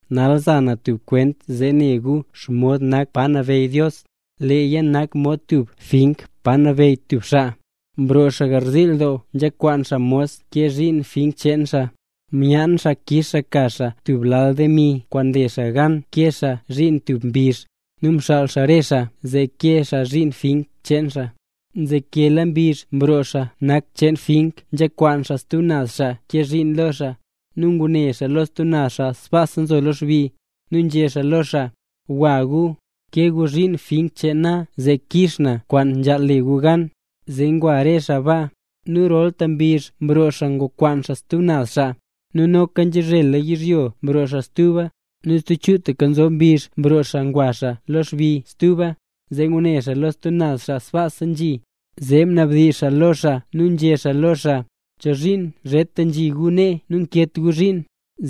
’Nal za na tub kwent zee ne gu xomod nak pa nabeyy Dios. Leeya nak mod tub fink pa nabeyy tub xaa. Mroo xaa garziil doo nzhakwaan xaa mos kee zhiin fink cheen xaa. Myaan xaa kix xaa ka xaa tub lal demi kwaan nle xaa gan kee xaa zhiin tub mbizh, nu mxaal xaa re xaa zee kee xaa zhiin fink cheen xaa. Nzekela mbizh mroo xaa nak cheen fink nzhakwaan xaa stub naz xaa kee zhiin lo xaa, nu ngune xaa lo stub naz xaa sbaasa nzo lo xbi. Nu nzhé xaa lo re xaa: “Gwa gu, kee gu zhiin fink cheen na zee kix na kwaan nzhaal le gu gan”. Zee ngwa re xaa ba. Nu rolta mbizh mroo xaa ngwakwaan xaa stub naz xaa, nu noka nzhazhela yizhyo mroo xaa stuba. Nu stub chutaka nzob mbizh mroo ngwa xaa lo xbi stuba, zee ngune lo stub naz xaa sbaasa nzhi. Zee mnabdizh xaa lo xaa nu nzhé xaa lo xaa: “¿Chozhiin zheta nzhi re gu nee nu nankeet gu zhiin?”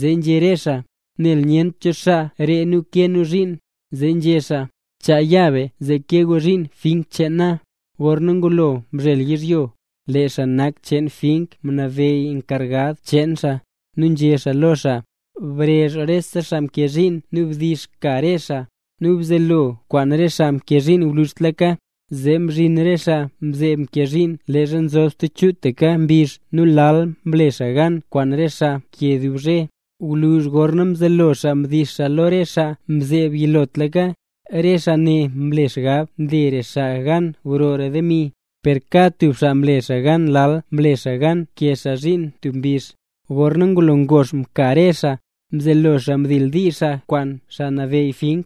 Zee nzhé re xaa: “Nel nyent cho xaa ree nu kee nu zhiin”. Zee nzhé xaa: “Chaa ya be zee kee gu zhiin fink cheen na”. ’Gorna ngulo mzhel yizhyo, lee xaa nak cheen fink mnabeyy enkargad cheen xaa, nu nzhé xaa lo xaa: “Brezh rese xaa mkee zhiin nu bdix ka re xaa, nu bzelo kwaan re xaa mkee zhiin gwluzhtlaka”. Zee mzhin re xaa mzeeb mkee zhiin leezha mzob stub chutaka mbizh nu lal mle xaa gan kwaan re xaa mkee dub zhe. Gwluzh gorna mzelo xaa mdix xaa lo re xaa mzeeb yilotlaka, re xaa ne mle xgab mlera xaa gan grora demi, per kad tub xaa mle gan lal kwaan nle xaa gan nkee xaa zhiin tub mbizh. Gorna ngulo ngox mka re xaa, mzelo xaa mdildiizh xaaya kwaan xaa nabeyy fink.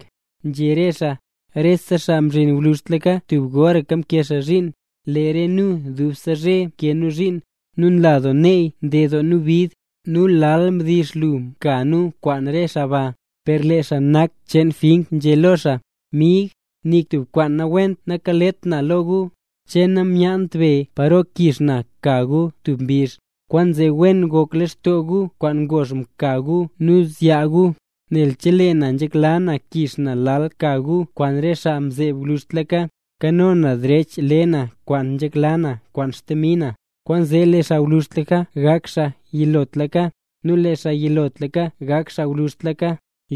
Nzhé re xaa: “Re xaa mzhin gwluzhtlaka tub goraka mkee xaa zhiin. Lee re nu dubse zhe mkee nu zhiin, nu nla doo neey mded doo nu bid, nu lal mdix lu mka nu kwaan re xaa ba.” Per lee xaa nak cheen fink nzhé lo re xaa: “Mig, nik tub kwaan nawent nakalet na lo gu. ¿Che namyaant be paro kix na ka gu tub mbizh? Kwaanzee wen gok lextoo gu kwaan ngox mka gu nu zyaa gu, nel chelee na nzhekla na kix na lal ka gu kwaan re xaa mzeeb gwluzhtlaka, nkano na derech le na kwaan nzhekla na kwaan xdemi na.” Kwaanzee lee xaa gwluzhtlaka gak xaa yilotlaka, nu lee xaa yilotlaka gak xaa gwluzhtlaka.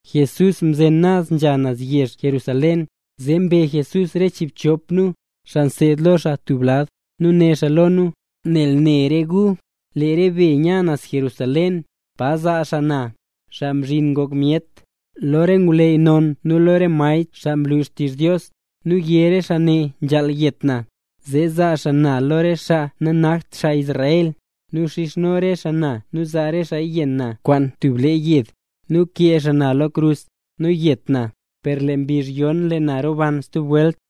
Jesús mzen naz nzha xaa naz Jerusalén, zee mbe Jesús re chiibchop nu, xaa mseed lo xaa tub lad, nu né xaa lo nu: —Nal ne re gu, lee re be ya naz Jerusalén, pa zaa xaa na, Xaa Mzhin Ngok Myet, lo re ngwleyy non nu lo re maestr xaa nlu xtizh Dios, nu yé re xaa ne nzhaal yet na. Zee zaa xaa na lo re xaa nanakt xaa Israel, nu xizhno re xaa na nu zaa re xaaya yenn na kwaan tub le yed, nu kee xaa na lo krus, nu yet na. Per lee mbizh yon lee na roban stub welt.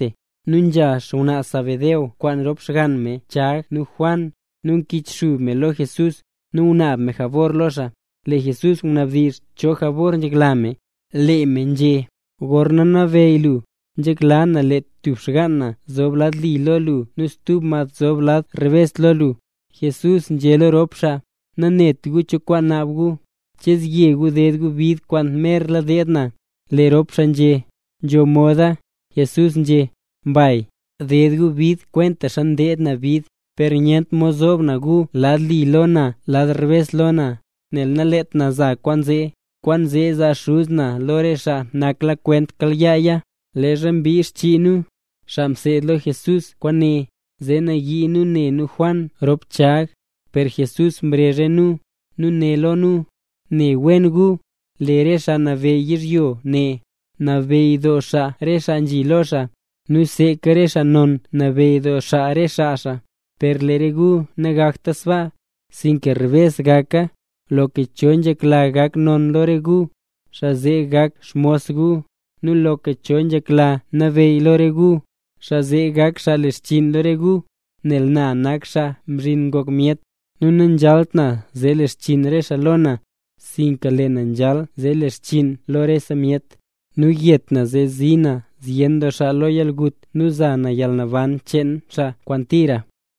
Nu nzha xngwnaa Zebedeo kwaan rop xgann me Chag nu Juan, nu mkichxub me lo Jesús, nu ngunaab me jabor lo xaa. Lee Jesús mnabdizh cho jabor nzhekla me. Lee me nzhé: —Gorna nabeyy lu, nzhekla na lee tub xgaan na zob lad li lo lu nu stub mad zob lad rebes lo lu. Jesús nzhé lo rop xaa: —Nanet gu cho kwaan naab gu. ¿Che zye gu ded gu bid kwaan merla deed na? Lee rop xaa nzhé: —Nzho moda. Jesús nzhé: —Mbay. Ded gu bid kwentaxa deed na bid. Per nyent mod zoob na gu lad li lo na nu lad rebes lo na, nel naleet na za kwaan zee. Kwaanzee zaa Xuz na lo re xaa naklakwent kayaaya. Leezha mbin xchii nu, xaa mseed lo Jesús kwaane, zee nayii nu ne nu Juan rop Chag. Per Jesús mrezh re nu, nu né lo nu: —Ne wen gu, lee re xaa nabeyy yizhyo ne, nabeyy doo xaa re xaa nzhi lo xaa, nu seeka re xaa non nabeyy doo xaa re xaa xaa. Per lo re gu nagakta sbaa, sinka rebes gaka. Loka cho nzhekla gak non lo re gu, xaa zee gak xmos gu. Nu loka cho nzhekla nabeyy lo re gu, xaa zee gak xaa le xchiin lo re gu. Nel na nak Xaa Mzhin Ngok Myet, nu nanzhalt na zee le xchiin re xaa lo na, sinka lee na nzhal zee le xchinn lo rese myet, nu yet na zee zii na zyen doo xaa lo yalgut nu za na yalnaban cheen xaa kwaan tira.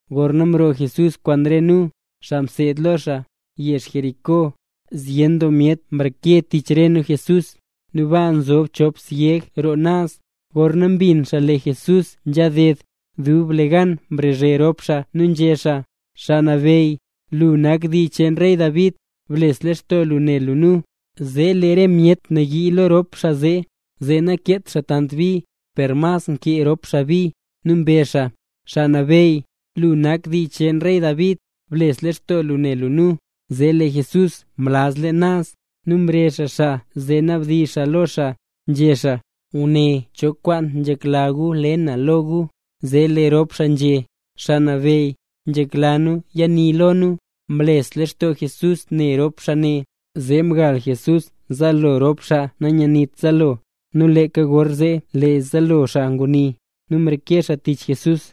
Gorna mroo Jesús kwaan re nu, xaa mseed lo xaa, yezh Jericó, zyen doo myet mreke tich re nu Jesús. Nu baa nzob chop syeg roo naz, gorna mbin xaa lee Jesús nzhaded, dublegan mrazhe rop xaa nu nzhé xaa: —Xaa Nabeyy, lu nak xaa dii cheen rey David, bles lextoo lu ne lu nu. Zee lee re myet nayii lo rop xaa zee, zee nakeet xaa tant bi. Per mas nkee rop xaa bi, nu mbezh xaa: —Xaa Nabeyy, lu nak xaa dii cheen rey David, bles lextoo lu ne lu nu. Zee lee Jesús mlaz leen naz, nu mrezh xaa xaa, zee nabdizh xaa lo xaa, nzhé xaa: —Guné nen cho kwaan nzhekla gu le na lo gu. Zee lee rop xaa nzhé: —Xaa Nabeyy, nzhekla nu yani lo nu. Mles lextoo Jesús ne rop xaa ne, zee mgal Jesús zaalo rop xaa nanyanit zaalo. Nu leeka gorzee lee zaalo xaa nguni, nu mreke xaa tich Jesús.